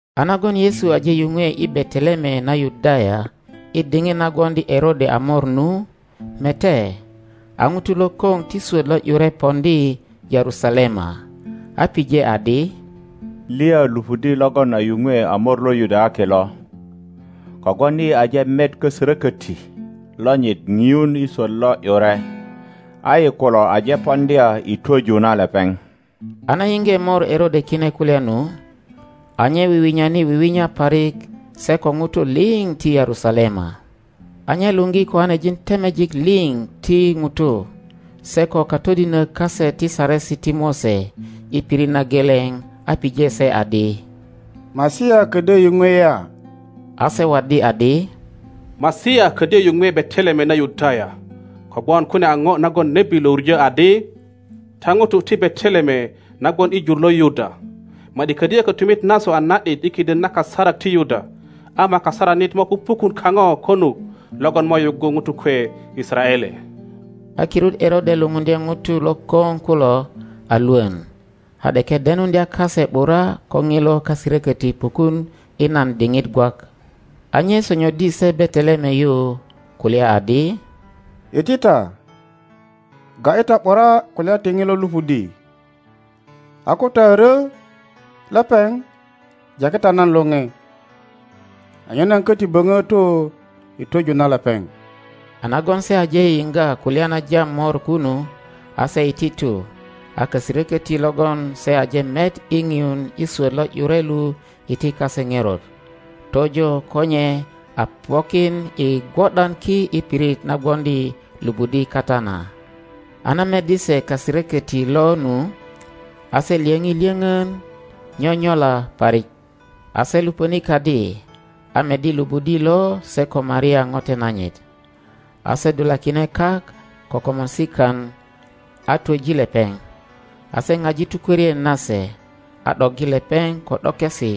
A nagon Yesu aje yuŋwe i Bete-leme na Yudaya i diŋit na gwoŋdi Erode a mor nu, mete, a ŋutu lokoŋ ti swot lo ’yure poŋdi Yerusalema, a pije adi, Liya lupudi logon a yuŋwe a mor lo Yudayaki lo? Kogwon yi aje met kaserokoti lonyit ŋiun i swot lo ’yure, a yi kulo aje poŋdya i twoju na lepeŋ. A na yiŋge mor Erode kine kulya nu, a nye wiwinyani wiwinya parik se ko ŋutu liŋ ti Yerusalema. A nye luŋgi koanejin temejik liŋ ti ŋutu, se ko katodinök kase ti Saresi ti Mose i pirit na geleŋ a pije se adi, Masia ködyö yuŋwe ya? A se waddi adi, Masia ködyö yuŋwe Beteleme na Yudaya; kogwon kune a ŋo nagon nebi lo wuŋö adi, Ta ŋutu ti Beteleme na gwon i jur lo Yuda, ma ’di ködyö kötumit nasu a na ’dit i kiden na kasarak ti Yuda, ama kasaranit mo pupukun kaŋö konut logon mo yuggu ŋutu kwe Yisaraele. A kirut Erode lupundye ŋutu lokoŋ kulo a lwön, a ’deke denuŋdya kase ’bura ko ŋilo kaserökoti pukun i nan diŋit gwak. A nye sonyoddi se Beteleme yu kulya adi, Iti ta, ga ’yi ta ’bura kulya ti ŋilo lupudi, a ko ta a ryö lepeŋ jaki ta nan lore, anyen nan köti böŋö tu i twöju na lepeŋ. A nagon se aje yiŋga kulya na jam mor kunu, a se iti tu, a kaseroköti logon se aje met i ŋiun i swöt lo ’yure lu iti kase ŋerot, tojo ko nye a pokin i gwo ’dan ki i pirit na gwoŋdi lupudi kata na. A na meddi se kaserökoti lo nu, a se lyöŋi lyöŋön nyonyola parik; a se lupöni kadi, a meddi lupudi lo se ko Maria ŋote nanyit. A se dulakine kak ko komorsikan a twoji lepeŋ, a se ŋaji tukworien nase, a ’doggi lepeŋ ko ’dokesi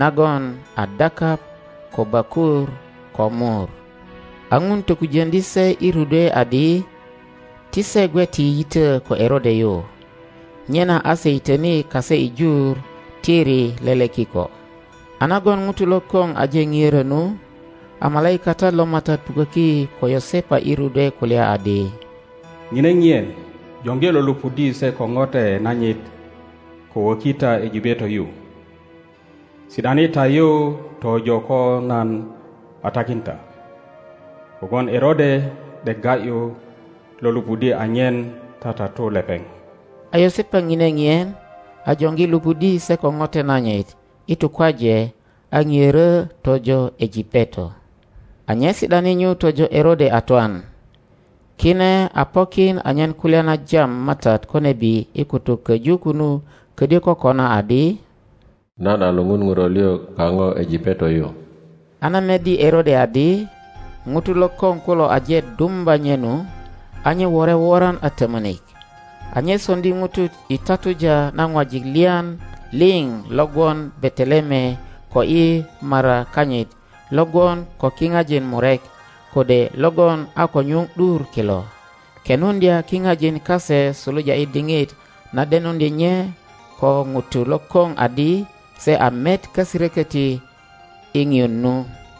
nagon a dakap, ko bökur, ko mur. A ŋun tokujoŋdi se i rudwe adi ti se gwe ti yito ko Erode yu, nyena a se yitöni kase i jur tiri lele kiko. A nagon ŋutu lokoŋ aje ŋiöro nu, a malaikatat lo MATAT puköki ko Yosepa i rudwe kulya adi, ŋine ŋien, joŋgi lo lupudi se ko ŋote nanyit, ko woki ta Ejipeto yu; si ’dani ta nyu tojo ko nan a takin ta, kogwon Erode ’dek ga ’yu lo lupudi anyen tatatu lepeŋ. A Yosepa ŋine ŋien, a joŋgi lupudi se ko ŋote nanyit i tukwaje a ŋiörö tojo Ejipeto, a nye si ’dani nyu tojo Erode a twan. Kine a pokin anyen kulya na jam MATAT ko nebi i kutuk köju kunu ködyö kokona, adi, Nan a luŋun ŋuro lio kaŋo Ejipeto yu, A na meddi Erode adi ŋutu lokoŋ kulo aje dumba nye nu, a nye wore woran a tömönik, a nye soŋdi ŋutu i tatuja na ŋwajik lyan lio lo gwon Beteleme ko i mara kanyit lo gwon ko kiŋajin murek, kode logon a ko nyuŋ ’dur kilo, kenuŋdya kiŋajin kase suluja i diŋit na denuŋdye nye ko ŋutu lokoŋ adi se a met kaserököti i ŋiun nu.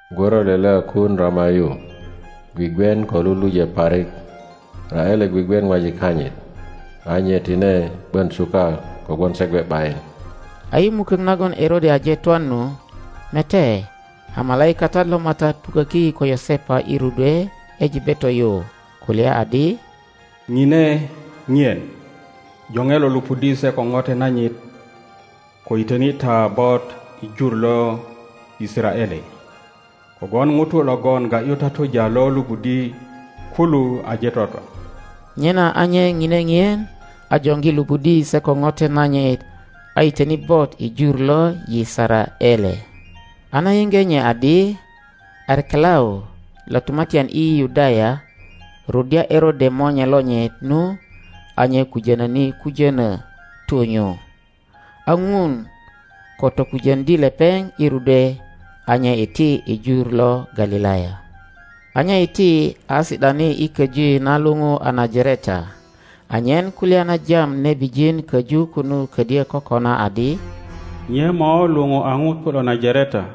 Gworo lele a kuun Rama yu, gwigwien ko lulujö parik, Raele gwigwien ŋwajik kanyit, a nye tine ’bön suka kogwon se gwe ’bayin. A i mukök nagon Erode aje twan nu, mete, a malaikatat lo MATAT puköki ko Yosepa i rudwe Ejipeto yu, kulya adi, Ŋine ŋien, joŋe lo lupudi se ko ŋote nanyit, ko yitöni ta bot i jur lo Yisaraele, kogwon ŋutu logon ga ’yu tatuja lo lupudi kulu aje twatwa. Nyena a nye ŋine ŋien, a joŋgi lupudi se ko ŋote nanyit a yitöni bot i jur lo Yisaraele. A na yiŋge nye adi Arkelau lo tumatyan i Yudaya ruddya Erode monye lonyit nu, a nye kujönöni kujönö tu nyu, a Ŋun ko tokujöŋdi lepeŋ i rudwe, a nye iti i jur lo Galilaya. a nye iti a si ’dani i köji na luiju a Najareta, anyen kulya na jam nebijin köju kunu ködyö kokona adi, Nye mo luou a ŋuto lo Najareta.